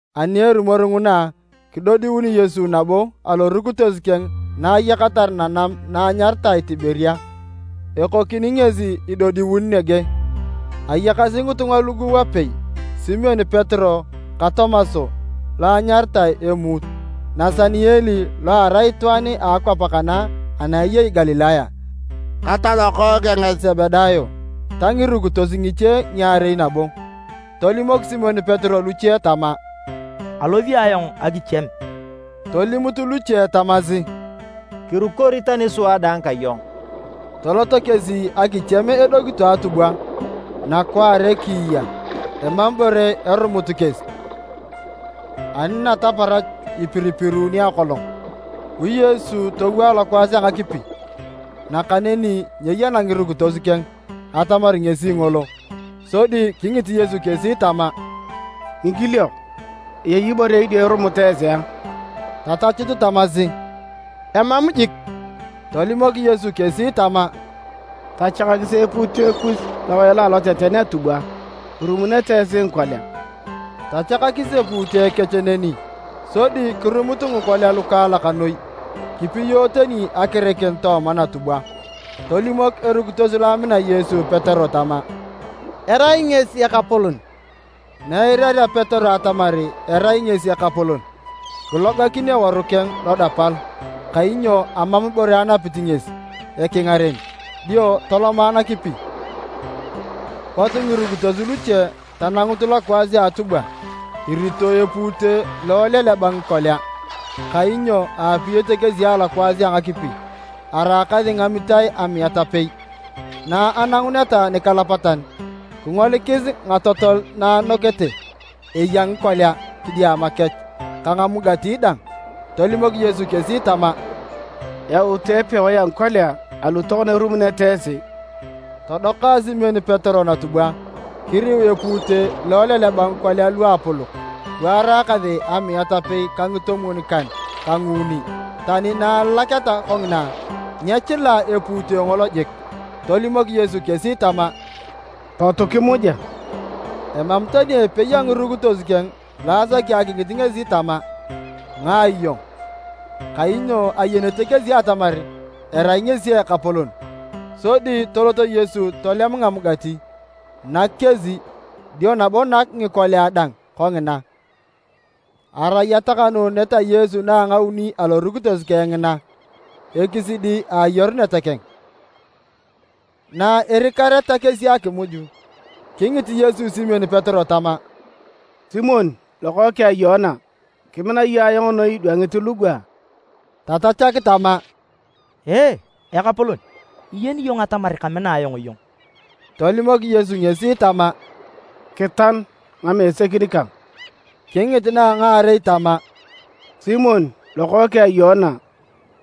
Ani erumor nguna, kidodiun Yesu nabo alorukitos keng na ayakatar nanam na enyaritae Tiberia. Ekokini ngesi idodiun nege. Ayakasi ngitunga lugu wapei, Simon Petero ka Tomas (lo anyaritae Emuut,) Nasaniel (lo arai itwaan a akwap a Kana ana eyei Galilaya,) ka talokookeng a Sebedayo, ta ngirukitos ngiche ngiarei nabo. Tolimok Simon Petero luche tama, “Alosi ayong akichiem.” Tolimut luche tamasi, “Kirukori tani sua dang ka iyong.” Toloto kesi akichiem edokito atubwa. Nakwaare kiiya, emam ibore erumut kesi. Ani nataparach ipiripiruuni akolong, bu Yesu towo alokwaas a ngakipi. Nakaneni nyeyana ngirukitos keng atamar ngesi ngolo. Sodi kingit Yesu kesi tama, “Ngikiliok! Eyei ibore idio irumut esi a?” Tatachut tamasi, “Emam jik.” Tolimok Yesu kesi tama, “Tachakakisi epuute kus lowae lo a aloteten a atubwa, irumunete esi ngikolia.” Tachakakis epuute kech neni sodi kirumut ngikolia lukaalak noi, kipiyo tani akirikin tooma natubwa. Tolimok erukitos lo amina Yesu Petero tama, “Erai ngesi Ekapolon!” Na eirarea Petero atamar erai ngesi Ekapolon, kilogakin eworu keng lodapal, (kainyo amam ibore anapit ngesi ekingaren) dio toloma nakipi. Pot ngirukitos luche tanangut lokwaas a atubwa, irito epuute lo eleleba ngikolia, kainyo aapiyete kesi alokwaas a ngakipi araakasi ngamitae amiat apei. Na ananguneta nikalapatan, kingolikis ngatotol na anokete, eya ngikolia kidiama kech ka ngamugati dang. Tolimok Yesu kesi tama, “Yautu epewae a ngikolia alu tokona irumunete esi.” Todoka Simon Petero natubwa, kiriu epuute lo eleleba ngikolia luapolok luaraakasi amiat apei ka ngitomwon-kan ka nguuni. Tani na alalaketa kongina, nyechila epuute ngolo jik. Tolimok Yesu kesi tama, “Potu kimuja.” Emam tani epei a ngirukitos keng lo asak akingit ngesi tama, “Ngae iyong?” Kainyo ayenete kesi atamar erai ngesi Ekapolon. Sodi tolot Yesu tolem ngamugati, nak kesi, dio nabo nak ngikolia dang kongina. Arai atakanuunet a Yesu na a ngauni alorukitos keng ngina, ekisidi a ayarunet keng. Na erikareta kesi akimuj, kingit Yesu Simon Petero tama, “Simon Lokookeng a Yoana, kimina iyong ayong noi idwangit lugu a?” Tatachak tama, “Ee, Ekapolon, iyeni iyong atamar kamina ayong iyong.” Tolimok Yesu ngesi tama, “Kitan ngimesekin kang.” Kingit na a ngaarei tama, “Simon Lokookeng a Yoana,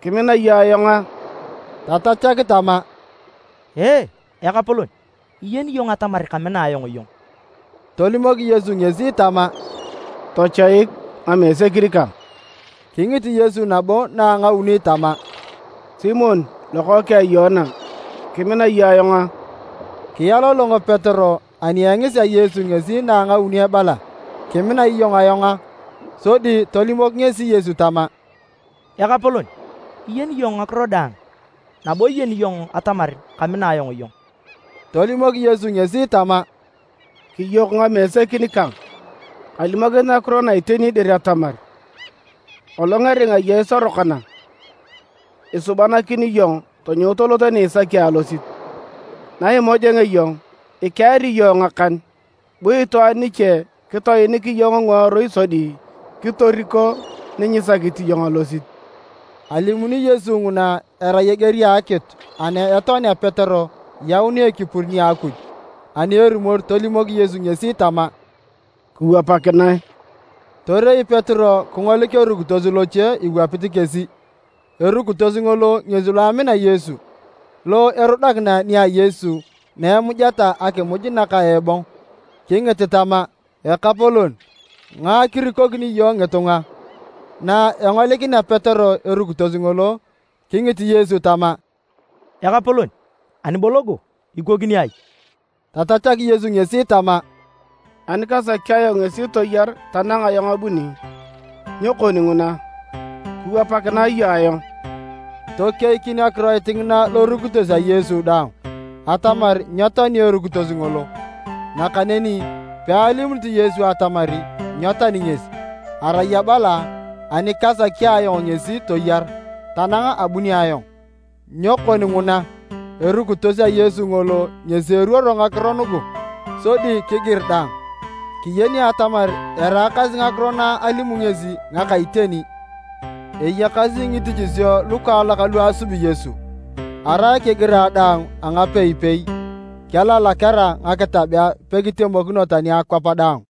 kimina iyong ayong a?” Tatachak tama, “Ee, Ekapolon, iyeni iyong atamar kamina ayong iyong.” Tolimok Yesu ngesi tama, “Tochoik ngamesekin kang.” Kingit Yesu nabo na a ngauni tama, “Simon lokookeng a Yoana, kimina iyong ayong a?” Kialolong Petero ani engisea Yesu ngesi na a ngauni ebala, “Kimina iyong ayong a?” Sodi tolimok ngesi Yesu tama, “Ekapolon, iyeni iyong ngakiro daang, nabo iyeni iyong atamar kamina ayong iyong!” Tolimok Yesu ngesi tama, “Kiyok ngamesekin kang. Kalimokinit ngakiro na iteni dir atamar, kolong eringa iyong isorokona, isubanakin iyong tonyou tolot ni isaki alosit. Na imojongea iyong, ikeari iyong ngakan, bu itwaan niche kitoenik iyong ngiworui sodi kitoriko ni nyisakit iyong alosit.” ( Alimuni Yesu nguna erai eger a akitu ana etoani Petero yaunea ekipur nia Akuj.) Ani erumor, tolimok Yesu ngesi tama, “Kiwapakinae!” Torei Petero kingolik erukitos loche iwapit kesi, erukitos ngolo ngesi lo amina Yesu, lo erudakina nia Yesu na emujeta akimuj naka ebong, kingit tama, “Ekapolon, ngae kirikokini iyong ngitunga?” Na engolikinea Petero erukitos ngolo, kingit Yesu tama, “Ekapolon, ani bo logo, ikokini ai?” Tatachak Yesu ngesi tama, “Ani kasaki ayong ngesi toyar tanang ayong abuni, nyo kon nguna? Kiwapakinae iyong ayong!” Tokeikin akiroit ngina lorukitos a Yesu daang atamar nyetoani erukitos ngolo. Nakaneni pealimunit Yesu atamar nyetoani ngesi, arai abala, “Ani kasaki ayong ngesi toyar tanang na abunio ayong, nyo kon nguna?” Erukitos a Yesu ngolo ngesi eruoro ngakiro nugu sodi kigir dang. Kiyeni atamar eraakasi ngakiro na alimuni ngesi ngaka iteni. Eyakasi ngitichisio lukaalak lu asubi Yesu. Arai kigirae daang angapei-pei, kelalaketa ngakitabea pekitemokin tani akwap daang.